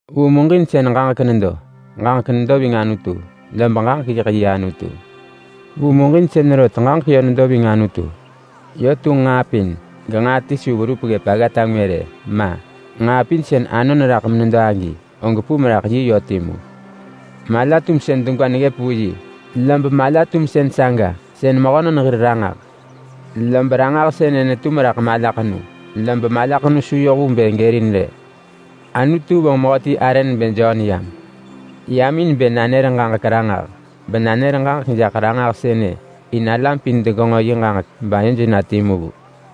Vu muġinsën Ġaġek nedo. Ġaġek nedo ving Anutu, lob Ġaġek yiḳ yi Anutu. Vu muġinsën rot Ġaġek yö nedo ving Anutu. Yö tunġ nġaa pin. Genġaa ti su verup ggëp aggata ngwë rë. Ma. Nġaa pin sën anon raḳ menedo agi, og pum raḳ yi yö timu. Mala-tumsën degwa neggëp vu yi, lob mala-tumsën saga sën mehönon hir Ranġah. Lob Ranġah sënë netum raḳ malaḳenu, lob malaḳenu su yoh vu bë gërin rë. Anutu vonġ mehöti arë nebë Jon yam. Yam in bë nanër ġaġek ranġah. Benanër ġaġek jaḳ Ranġah sënë in alam pin degenġo yi ġaġek bayoj na timu vu.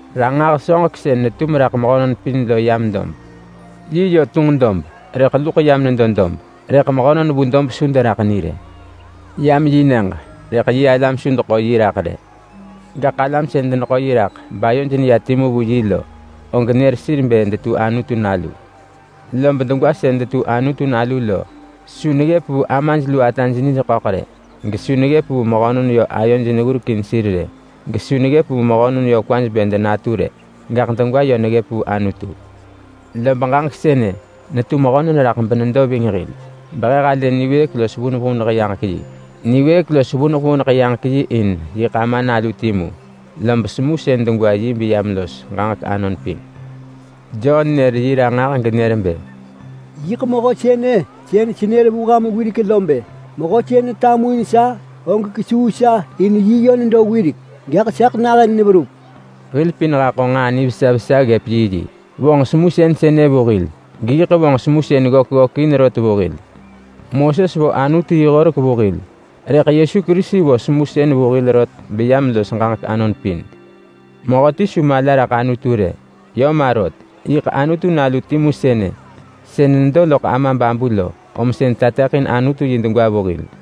Ranġah soġek sën netum raḳ mehönon pin lo yam dob. Yi yö tunġ dob, rëḳ luḳ yam nedo dob, rëḳ mehönon vu dob su deraḳ ni rë. Yam yi nyëġ, rëḳ yi alam su deḳo yi raḳ rë. Gaḳ alam sën deneḳo yi raḳ bayoj neya timu vu yi lo, og nër sir bë detu Anutu nalu. Lob degwa sën detu Anutu nalu lo su neggëp vu amaj lu ataj nij ḳöḳ rë, gesu neggëp vu mehönon yö ayoj neggurekin sir rë, gesu neggëp vu mehönon yö kwaj bë denatu rë. Gaḳ degwa yö neggëp vu Anutu. Lob Ġaġek sënë netu mehönon raḳ benedo ving hil, behe halë niwëëk los vuneḳ vuneḳ yaġek yi. Niwëëk los vuneḳ vuneḳ yaġek yi in yiḳ Ama Nalu timu, lob semusën degwa yi beyam los ġaġek anon pin. Jon nër yi ranġah genër bë. “Yiḳ mehö sënë sën senër vu ham wirek lo bë, ‘Mehö sën netamuin sa, og kesuu sa in yö nedo wirek, gaḳ saḳ nahën neverup.’” Hil pin haḳo nġaa nivesa vesa ggëp yiyi. Vonġ semusën sënë vu hil, geyiḳ vonġ semusën ggök ggökin rot vu hil. Moses vo Anutu yi horek vu hil, rëḳ Yesu Kerisi vo semusën vu hil rot beyam los ġaġek anon pin. Mehöti su mala raḳ Anutu rë. Yö ma rot. Yiḳ Anutu Nalu timu sënë, sën nedo loḳ Ama babu lo, om sën tateḳin Anutu yi degwa vu hil.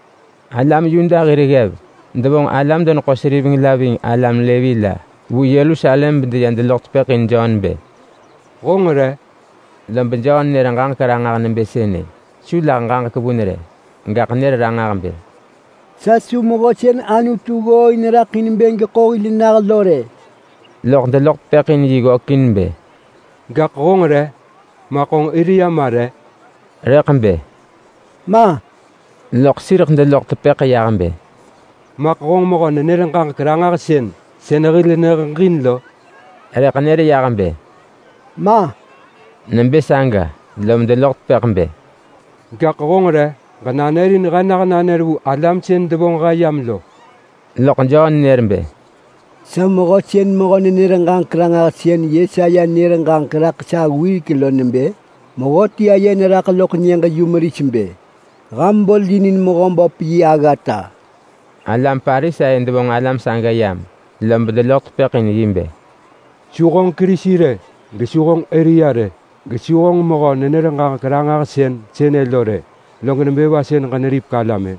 Alam Yuda hir ggev devonġ alam-deneḳo-seriveng la ving alam Levi la vu Yerusalem beya deloḳ tepëḳ in Jon bë, “Honġ re?” Lob Jon nër ġaġek ranġah nebë sënë. Su lah ġaġek vun rë, gaḳ nër ranġah bë, “Sa su Mehö sën Anutu ggooin raḳ in bë geḳo hil nah lo rë!” Loḳ deloḳ tepëḳ in yi ggökin bë, “Gaḳ honġ re? Maḳ honġ Elia ma re?” Rëḳ bë, “Ma!” Loḳ sireḳ deloḳ tepëḳ yah bë, “Maḳ honġ mehö-nenër-ġaġek-ranġahsën sën hil neheġin lo?” Rëḳ nër yah bë, “Ma!” Nebë saga lom deloḳ tepëḳ bë, “Gaḳ honġ re? Ġenanër in he nah nanër vu alam sën devonġ he yam lo!” Loḳ Jon nër bë, “Sa mehö sën mehö-nenër-ġaġek-ranġahsën Yesaya nër ġaġek raḳ sa wirek lo nebë: ‘Mehöti aye neraḳ loḳ nyëġ-yumeris bë, “Ham bolinin Mehöböp yi aggata!”’” Alam Parisai devonġ alam saga yam, lob deloḳ tepëḳ in yi bë, “Su honġ Kerisi rë, gesu honġ Elia rë, gesu honġ mehö-nenër-ġaġek-ranġahsën sënë lo rë, loḳ nebë va sën ġeneripek alam-ë?”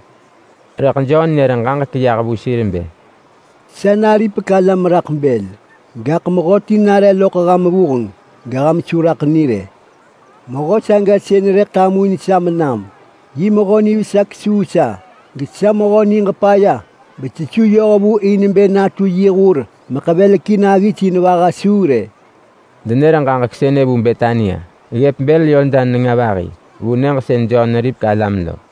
Rëḳ Jon nër ġaġek yah vu sir bë, “Sa naripek alam raḳ bël. Gaḳ mehöti nare loḳ ham vuheng, geham su raḳ ni rë. Mehö saga sën rëḳ tamuin sa menam. Yi mehö nivesa kesuu sa, gesa mehö niġ paya besesu yohvu in bë natu yi hur meḳevelekin aggis in vaha suu rë.” Denër ġaġek sënë vu Betania ggëp bël Yordan nenga vahi vu nyëġ sën Jon neripek alam lo.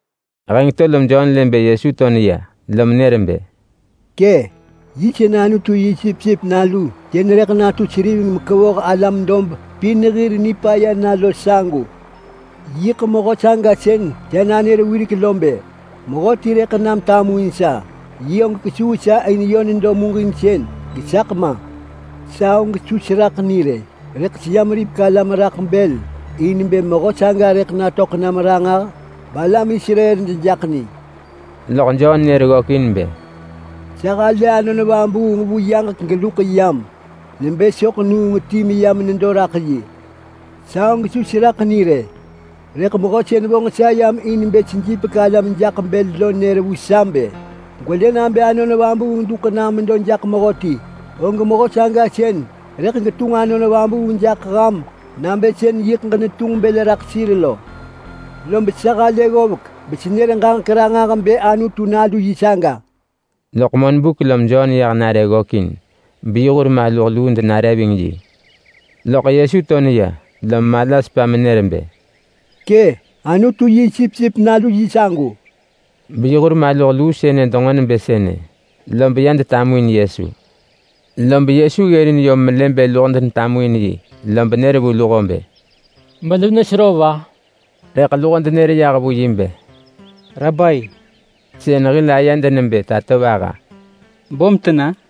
Heng to lom Jon lë bë Yesu to neya lom nër bë, “Kë! Yi sën Anutu yi sipsip nalu sën rëḳ natu seriveng mekevoh alam dob pin hir nipaya na lo sagu. Yiḳ mehö saga sën sa nanër wirek lo bë, ‘Mehöti rëḳ nam tamuin sa, yi og kesuu sa in yö nedo muġin, gesaḳ ma!’ Sa og su seraḳ ni rë. Rëḳ seyam ripek alam raḳ bël in bë mehö saga rëḳ natöḳ nam ranġah balam Israel dejaḳ ni.” Lob Jon nër ggökin bë, “Sa halë Anon Vabuung vu yaġek geluḳ yam nebë soḳ nuung ti meyam nedo raḳ yi. Sa og su seraḳ ni rë, rëḳ Mehö sën vonġ sa yam in bë sejipek alam jaḳ bël lo nër vu sa bë, ‘Gwelë nabë Anon Vabuung duḳ nam medo jaḳ mehöti, og mehö saga sën rëḳ getunġ Anon Vabuung jaḳ ham nabë sën nġo ġenetunġ bël raḳ sir lo.’ Lob sa halë ggovek besenër ġaġek ranġah bë Anutu nalu yi saga.” Loḳ monbuk lob Jon yah nare ggökin beyi hur maluh luu denare ving yi. Loḳ Yesu to neya, lom mala sepa menër bë, “Kë! Anutu yi sipsip nalu yi sagu!” Beyi hur maluh luu sënë denġo nebë sënë, lob ya detamuin Yesu. Lob Yesu ggërin yom melë bë luho denetamuin yi lob nër vu luho bë, “Melu nesero va?” Rëḳ luho denër yah vu yi bë, “Rabai! (Sën hil ayed nebë Tatovaha). Böm tena?”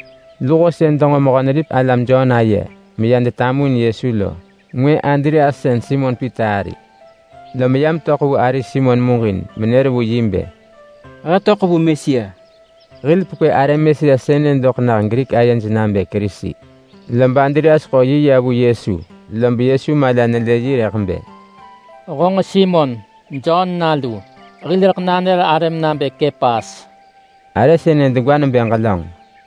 Luho sën denġo Mehö-neripek-alam Jon aye meya detamuin Yesu lo ngwë Andreas sën Simon Pita ari. Lom ya metöḳ vu ari Simon muġin menër vu yi bë, “He töḳ vu Mesia!” (Hil pekwë arë Mesia sënë doḳ nah Grik ayej nabë Kerisi.) Lob Andreas ḳo yi ya vu Yesu, lob Yesu mala nelë yi rëḳ bë, “Honġ Simon, Jon nalu. Hil rëḳ nanër arëm nabë Kepas!” (Arë sënë degwa nebë Ġelönġ.)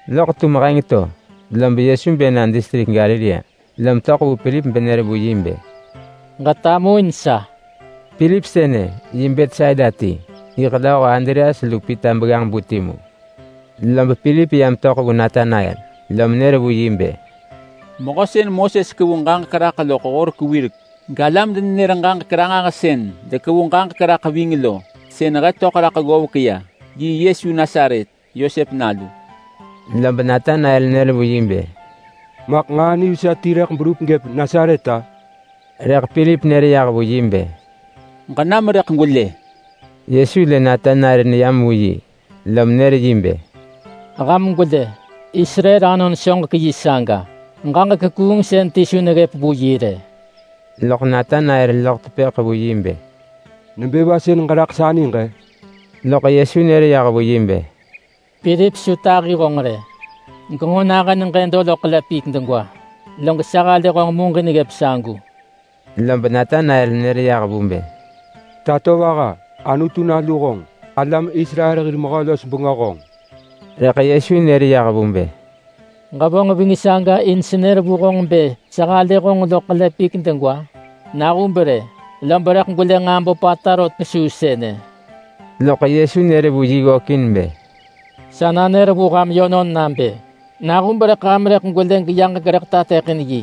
Loḳ tum heng to lob Yesu bë na distrik Galilea. Lom töḳ vu Pilip benër vu yi bë, “Ġetamuin sa!” Pilip sënë yi Betsaida ti, yiḳ lööho Andreas lu Pita begganġ-bu timu. Lob Pilip ya metöḳ vu Natanael, lom nër vu yi bë, “Mehö sën Moses kevu ġaġek raḳ loḳ horek wirek galam-denenër-ġaġek-ranġahsën dekevu ġaġek raḳ ving lo sën he töḳ raḳ ggovek ya. Yi Yesu Nasaret, Yosep nalu.” Lob Natanael nër vu yi bë, “Maḳ nġaa nivesa ti rëḳ berup gëp Nasaret-a?” Rëḳ Pilip nër yah vu yi bë, “Ġenam rëḳ gwelë!” Yesu lë Natanael neyam vu yi, lom nër yi bë, “Ham gwelë! Israel anon soġek yi saga! Ġaġek kuungsën ti su neggëp vu yi rë!” Loḳ Natanael loḳ tepëḳ vu yi bë, “Nebë va sën ġeraḳ sa niġ-ë?” Loḳ Yesu nër yah vu yi bë, “Pilip su tahi honġ rë genġo nahën ġëdo loḳ ḳele pik degwa, log sa halë honġ muġin ggëp sagu.” Lob Natanael nër yah vu bë, “Tatovaha! Anutu nalu honġ! Alam Israel hir Mehö-los-bengö honġ!” Rëḳ Yesu nër yah vu bë, “Ġevonġ ving saga in senër vu honġ bë sa halë honġ loḳ ḳele pik degwa? Nahub rë, lob rëḳ gwelë nġaa böpata rot kesuu sënë!” Loḳ Yesu nër vu yi ggökin bë, “Sa nanër vu ham yönon nabë nahub rëḳ ham rëḳ gwelë yaġek rëḳ tateḳin yi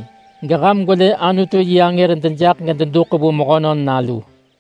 geham gwelë Anutu yi angër dejaḳ gededuḳ vu Mehönon Nalu.”